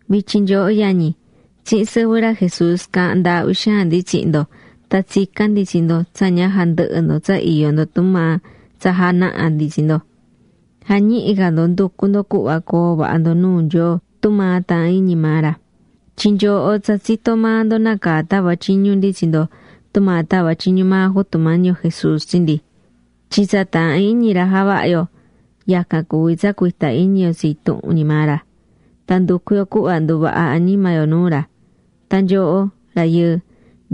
Vityin nyooho yañi, tsihin sɨvɨ ra Jesús caahán ndaahví xaan ndi tsihin ndo tan tsicán ndi tsi ndo tsa ña jandɨhɨ ndo tsa iyó ndo tumaa tsa janaha̱ ndi tsi ndo. Ja̱ñihi ca ndo nducu ndo cuhva coo vaha ndo nuu Nyoo tumaa taahán iñi maa ra. Tyin nyooho tsa tsitó maa ndo nácaa tava̱ tyiñu ndi tsi ndo tumaa tava̱ tyiñu maa Jutu Mañi yo Jesús tsi ndi. Tyin tsa taahán iñi ra javaha yo yacan cuví tsa cuita iñi yo tsi intuhun ñi maa ra, tan nducu yo cuhva nduvaha añima yo nuu ra. Tan nyooho, rayɨɨ,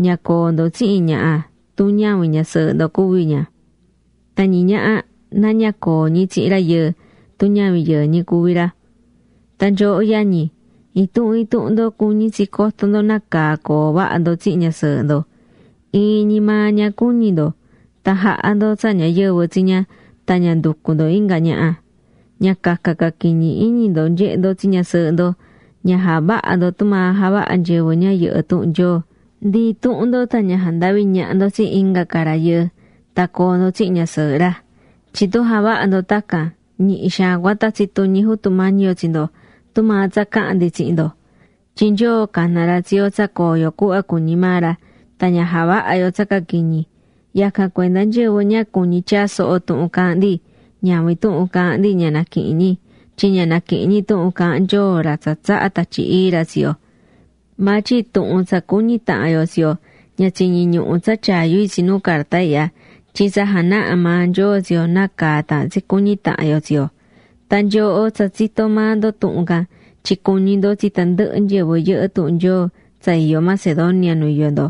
ña coo ndo tsihin ñaha tun ñavin ñasɨɨhɨ ndo cuví ña, tan ñiñaha na ña coo ñi tsihin rayɨɨ tun ñavin yɨɨ ñi cuvi ra. Tan nyooho yañi, intuhun intuhun ndo cuñí tsi coto ndo nácaa coo vaha ndo tsihin ñasɨɨhɨ ndo. Iin ñi maa ña cuñi ndo tan ja̱ha ndo tsa ñayɨvɨ tsi ña tan ña nducu ndo inga ñaha. Ña caca caquiñi iñi ndo nyehe ndo tsi ñasɨɨhɨ ndo, ña ja̱vaha ndo tumaa javahá nyɨvɨ ña yɨhɨ́ tuhun Nyoo. Ndi intuhun ndo tan ña jandavi ñaha ndo tsi inga ca rayɨɨ tan coo ndo tsihin ñasɨɨhɨ ra naha. Tyin tun javaha ndo tacan, ñihi xaan cua tatsi tuñi Jutu Mañi yo tsi ndo, tumaa tsa caha̱n ndi tsihin ndo. Tyin Nyoo cana̱ ra tsi yo tsa coo yo cuhva cuñí maa ra, tan ña javaha yo tsa caquiñi. Yacan cuenda nyɨvɨ ña cuñí tyaa soho tuhun caahán ndi, ñavin tuhun caahán ndi ña naquihin ñi, tyin ña naquihin ñi tuhun caahán Nyoo ra tsa tsahá Tatyi Ii ra tsi yo. Maa tyin tuhun tsa cuñí tahan yo tsi yo ña tsiñí ñuhu tsa tyaa yu itsi nu carta ihya. Tyin tsa janaha̱ maa Nyoo tsi yo nácaa taahán tsi cuñi tahan yo tsi yo. Tan nyooho tsa tsitó maa ndo tuhun can tyin cuñí ndo tsi tandɨhɨ nyɨvɨ yɨhɨ́ tuhun Nyoo tsa iyó Macedonia nu iyó ndo.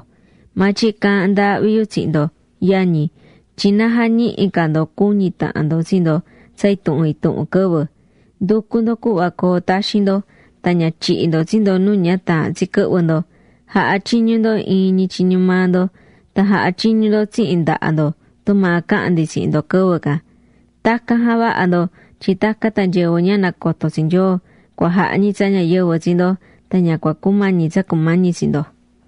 Maa tyin caahán ndaahvi yu tsihin ndo, yañi, tyin na jañihi ca ndo cu̱ñi tahan ndo tsi ndo tsa intuhun intuhun quɨvɨ. Ndu̱cu ndo cuhva coo taxin ndo. Tan ña tyihi ndo tsi ndo nu ña taahán tsi quɨhvɨ ndo. Ja̱ha tyiñu ndo iin ñi tyiñu maa ndo. Tan ja̱ha tyiñu ndo tsihin ndaha ndo tumaa caha̱n ndi tsihin ndo quɨvɨ can. Tacan ja̱vaha ndo tyin tacan tan nyɨvɨ ña nacotó tsi Nyoo cua jaha ñi tsa ñayɨvɨ tsi ndo. Tan ña cua cumañi tsa cumañi tsi ndo.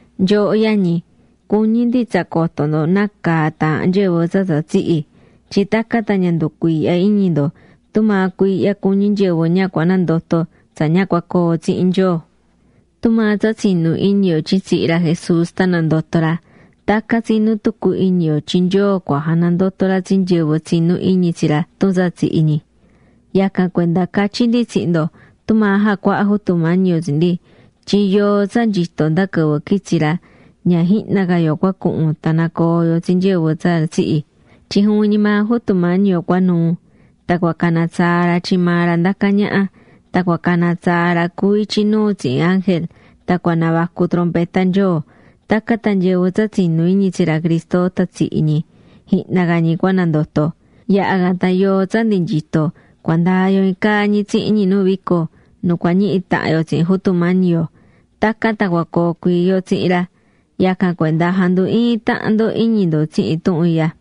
Nyooho yañi, cuñí ndi tsa coto ndo nácaa taahán nyɨvɨ tsa tsa tsihi̱, tyin tacan tan ña nducuiihya iñi ndo tumaa cuiihya cuñí nyɨvɨ ña cua nandoto tsa ña cua coo tsihin Nyoo. Tumaa tsa tsinú iñi yo tyin tsihi̱ ra Jesús tan nandoto̱ ra, tacan tsinú tucu iñi yo tyin Nyoo cua janandoto ra tsi nyɨvɨ tsinú iñi tsi ra tun tsa tsihi̱ ñi. Yacan cuenda catyí ndi tsihin ndo tumaa jacuaha̱ Jutu Mañi yo tsi ndi, tyin yoo tsa nyito nda quɨvɨ quitsi ra, ña jihna ca yo cua cuhun tan nacoo yo tsi nyɨvɨ tsa tsihi̱. Tyin juvin ñi maa Jutu Mañi yo cua nuu, tan cua cana tsaa ra tyin maa ra ndacá ñaha. Tan cua cana tsaa ra cuví ityi nuu tsihin ángel. Tan cua navacu trompeta Nyoo. Tacan tan nyɨvɨ tsa tsinú iñi tsi ra Cristo tan tsihi̱ ñi, jihna ca ñi cua nandoto. Yaha̱ can tan yoo tsa ndi nyito cua ndaa yo iin caa ñi tsihin ñi nu vico, nu cua ñihi tahan yo tsihin Jutu Mañi yo. Tacan tan cua coo cuii yo tsihin ra. Yacan cuenda ja̱ndu iin tahan ndo iñi ndo tsihin tuhun ihya.